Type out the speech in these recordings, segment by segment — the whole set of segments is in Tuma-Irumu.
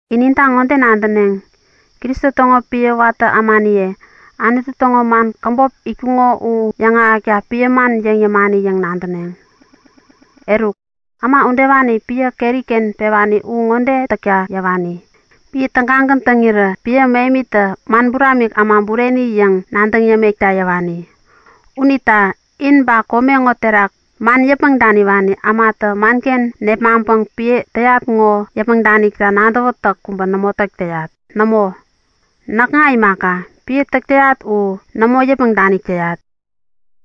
In ninta ŋode nadäneŋ; Kristo täŋo piä watä ämaniye, Anutu täŋo man käbop itkuko u yäŋahäkta piä man yäŋ yämani yäŋ nadäneŋ. Eruk, äma udewani piä keri-ken pewani u ŋode täkta yäwani; Piä tägagän täŋirä piä mähemitä man buramik äma bureni yäŋ nadäŋ yämekta yäwani. Unita in ba kome ŋo terak man yäpmäŋ daniwani ämatä manken nepmaŋpäŋ piä täyat u yäpmäŋ danikta nadäwätäk kubä nämo täk täyat. Nämo, näkŋa imaka, piä täk täyat u nämo yäpmäŋ danik täyat.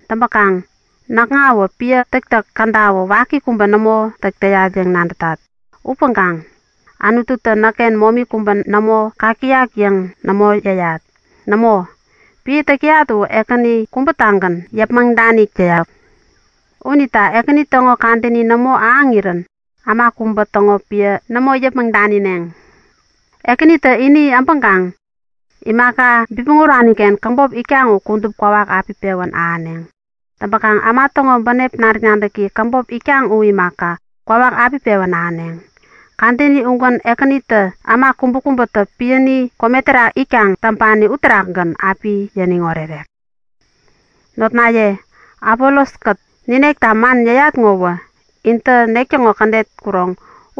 Täŋpäkaŋ näkŋawä piä täktäk kädawä waki kubä nämo täk täyat yäŋ nadätat. Upäŋkaŋ Anututä näkken momi kubä nämo kak täyak yäŋ nämo yäyat. Nämo, piä täk täyat u Ekäni kubä-tägän yäpmäŋ danik täyak. Unita Ekäni täŋo kadäni nämo ahäŋirän äma kubä täŋo piä nämo yäpmäŋ danineŋ. Ekänitä ini äbäŋkaŋ imaka bipmäŋ urani-ken käbop itkaŋ u kudup kwawak api pewän ahäneŋ. Täŋkaŋ äma täŋo bänep nadäk-nadäki käbop itak u imaka, kwawak api pewän ahäneŋ. Kadäni ugän Ekänitä äma kubäkubätä piäni kome terak itkaŋ täŋpani uterakgän api yäniŋ orerek. Notnaye, Apolos-kät ninekta man yäyat ŋowä intä nek-täŋo kädet kuroŋ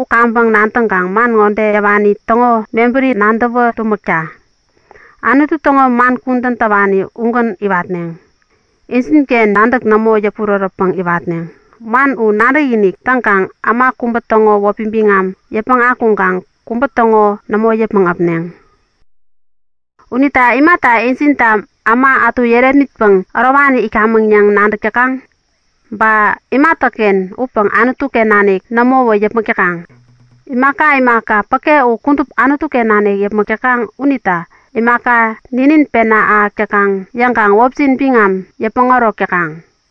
u kaŋpäŋ nadäŋkaŋ man ŋode yäwani täŋo mebäri nadäwä tumäkta; Anutu täŋo man kudän täwani ugän iwatneŋ. Injinken nadäk nämo yäpurärätpäŋ iwatneŋ. Man u nadäkinik täŋkaŋ äma kubä täŋo wäpi biŋam yäpmäŋ akuŋkaŋ kubä täŋo nämo yäpmäŋ äpneŋ. Unita imata injinta äma ätu yärepmitpäŋ ärowani itkamäŋ yäŋ nadäk täkaŋ? Ba imatäken upäŋ Anutu-ken nanik nämowä yäpmäk täkaŋ? Imaka imaka päke u kudup Anutu-ken nanik yäpmäk täkaŋ unita imata ninin pena ahäk täkaŋ yäŋkaŋ wäpjin biŋam yäpmäŋ ärok täkaŋ?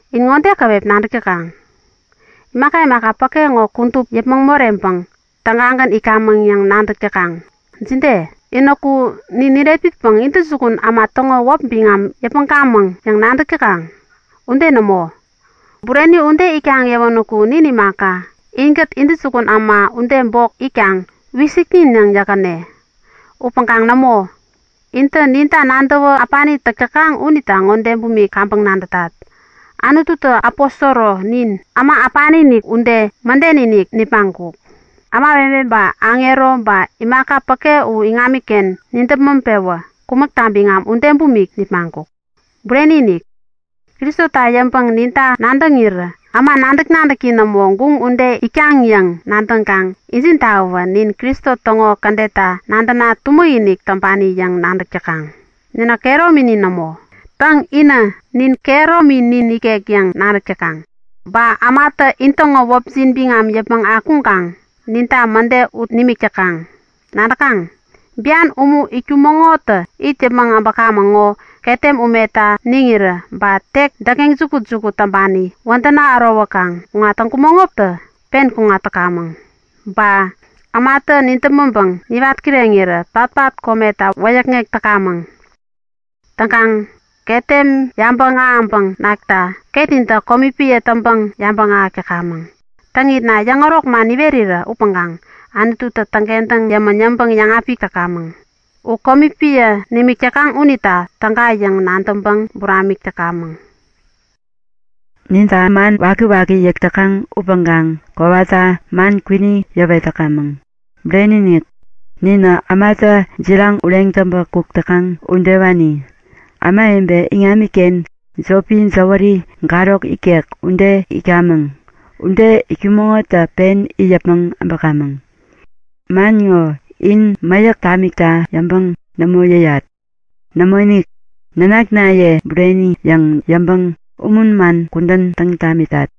In ŋode käwep nadäk täkaŋ; Imaka imaka päke ŋo kudup yäpmäŋ moreŋpäŋ tägagän itkamäŋ yäŋ nadäk täkaŋ. Jide? Inäku nin nirepmitpäŋ intäjukun äma täŋo wäp biŋam yäpmäŋkamäŋ yäŋ nadäk täkaŋ? Ude nämo! Bureni ude itkaŋ yäwänäku nin imaka, inkät intäjukun äma ude bok itkaŋ Wisikinik yäŋ yäkkäne. Upäŋkaŋ nämo! Intä ninta nadäwä äpani täk täkaŋ unita ŋode bumik kaŋpäŋ nadätat; Anututä aposoro nin, äma äpani-inik ude, mäden-inik nipmaŋkuk. Ämawebe ba aŋero ba imaka päke u iŋamiken nidäpmäŋ-pewä kumäkta biŋam ude bumik nipmaŋkuk. Bureni-inik! Kristota yäŋpäŋ ninta nadäŋirä äma nadäk-nadäki nämo, guŋ ude itkaŋ yäŋ nadäŋkaŋ injintawä nin Kristo täŋo kädetta nadäna tumäk-inik täŋpani yäŋ nadäk täkaŋ. Ninä kehärominin nämo. Täŋ, inä Nin kehärominin nikek yäŋ nadäk täkaŋ. Ba ämatä intäŋo wäpjin biŋam yäpmäŋ akuŋkaŋ ninta mäde ut nimik täkaŋ. Nadäkaŋ? Bian umu itkumäŋotä it yäpmäŋ äbäkamäŋ ŋo ketem umeta niŋirä, ba tek däkŋeŋ jukut-jukut täŋpani wädäna ärowäkaŋ kuŋat täŋkumäŋotä pen kuŋatkamäŋ. Ba ämatä nidäpmäŋpäŋ niwat kireŋirä patpat kometa wäyäkŋek täkamäŋ. Täŋkaŋ ketem yabäŋ ahäŋpäŋ nakta ketnintä komi piä täŋpäŋ yabäŋ ahäk täkamäŋ. Täŋitna yäŋärok man niwerirä upäŋkaŋ Anututä täŋkentäŋ yämän yäŋpäŋ yäŋapik täkamäŋ. U komi piä nimik täkaŋ unita täga yäŋ nadäŋpäŋ buramik täkamäŋ. Ninta man wakiwaki yäk täkaŋ upäŋkaŋ kowata man kwini yäwet täkamäŋ. Bureni-inik! Ninä ämatä jiraŋ ureŋ täŋpä kuk täkaŋ udewani. Ämawebe iŋamiken jopi jäwäri, garok ikek ude itkamäŋ. Ude itkumäŋotä pen it yäpmäŋ äbäkamäŋ. Man ŋo in mäyäk tamikta yäŋpäŋ nämo yäyat. Nämoinik, nanaknaye bureni yäŋ yäŋpäŋ umun man kudän täŋ tamitat.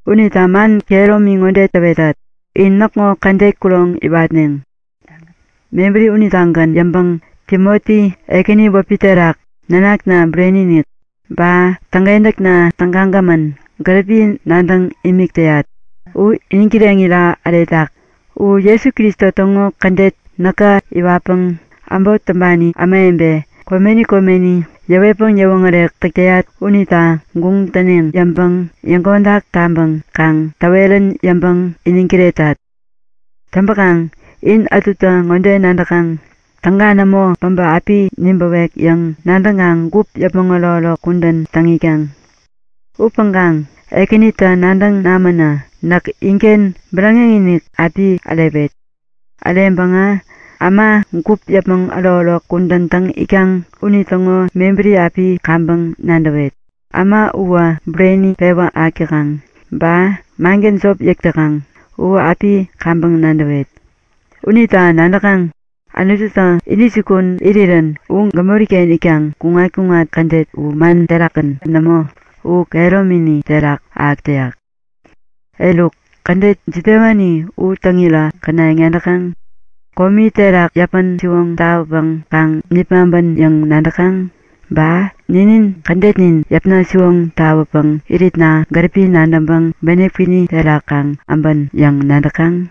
Unita man kehäromi ŋode täwetat; In näkŋo kädet kuroŋ iwatneŋ. Mebäri unitagän yäŋpäŋ Timoti, Ekäni wäpi terak nanakna bureni-inik ba täŋkentäkna tägagämän, gäripi nadäŋ imik täyat u iniŋ kireŋira äretak. U Jesu Kristo täŋo kädet näkä iwatpäŋ äbot täŋpani ämawebe komeni komeni yäwetpäŋ yäwoŋärek täk täyat unita guŋ täneŋ yäŋpäŋ yäŋkodak taŋpäŋ kaŋ täwerän yäŋpäŋ iniŋ kiretat. Täŋpäkaŋ in ätutä ŋode nadäkaŋ; Täga nämo päbä api nibäwek yäŋ nadäŋkaŋ gup yäpmäŋ ärokärok kudän täŋ itkaŋ. Upäŋkaŋ Ekänitä nadäŋ namänä näk inken bäräŋeŋ-inik api ärewet. Äreŋpäŋä äma gup yäpmäŋ ärokärok kudän täŋ itkaŋ unitäŋo mebäri api kaŋpäŋ nadäwet. Äma uwä bureni pewä ahäk täkaŋ ba mangän jop yäk täkaŋ u api kaŋpäŋ nadäwet. Unita nadäkaŋ? Anututä intäjukun irirän gämori-ken itkaŋ kuŋat-kuŋat kädet u man terakgän nämo, u kehäromini terak ahäk täyak. Eruk, kädet jidewani u täŋira känayäŋ nadäkaŋ? Komi terak yäpän-siwoŋ tawäpäŋ kaŋ nipmaŋpän yäŋ nadäkaŋ? Ba ninin kädetnin yäpna siwoŋ tawäpäŋ iritna gäripi nadäŋpäŋ bänep kwini terak kaŋ äbän yäŋ nadäkaŋ?